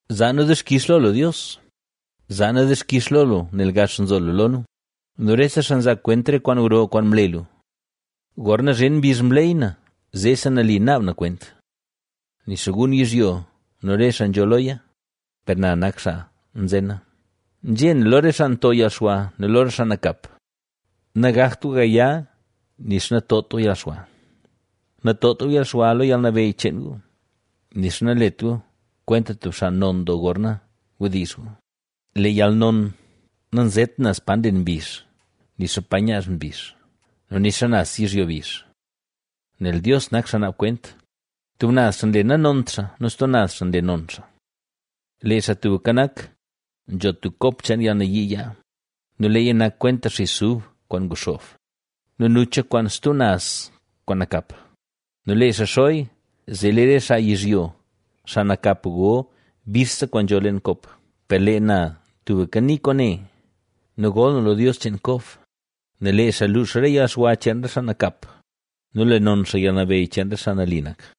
Zaa nu dixkix lo lu Dios, zaa nu dixkix lo lu, nel gax nzo lu lo nu nu rese xaa nzaa kwent re kwaan gro kwaan mle lu. Lu né: “Gorna zhin mbizh mleyy na, zeesi nali naab na kwent. Nixa gun yizhyo nu re xaa nzho loya, per na nak xaa nzena”. Nzhé na lo re xaa nto yalxwa nu lo re xaa nakap: “Nagakt gu gaya nixa natot gu yalxwa. Natot gu yalxwa lo yalnabeyy cheen gu, nixa nalet gu kwenta tub xaa non doo gorna wdizh gu.” Lee yalnon nanzet naz pa nlen mbizh, nixa pa nyaaz mbizh nu nixa naz yizhyo bizh. Nel Dios nak xaa naab kwent, tub naz xaa nle nanont xaa nu stub naz xaa nle non xaa. Lee Xaa Tubka Nak, nzho tub kop cheen yalnayii yaa nu leeya nak kwenta xis ub kwaan nguxoob nu nucha kwaan stub naz kwaan nakap nu lee xaa xoya, zee lee re xaa yizhyo, xaa nakap, go bixse kwaan nzho leen kop. Per lee na tubka nii kwaane nu gol na lo Dios cheen Kob. Nel lee xaa luux re yalxwa cheen re xaa nakap nu le non xaa yalnabeyy cheen re xaa nali nak.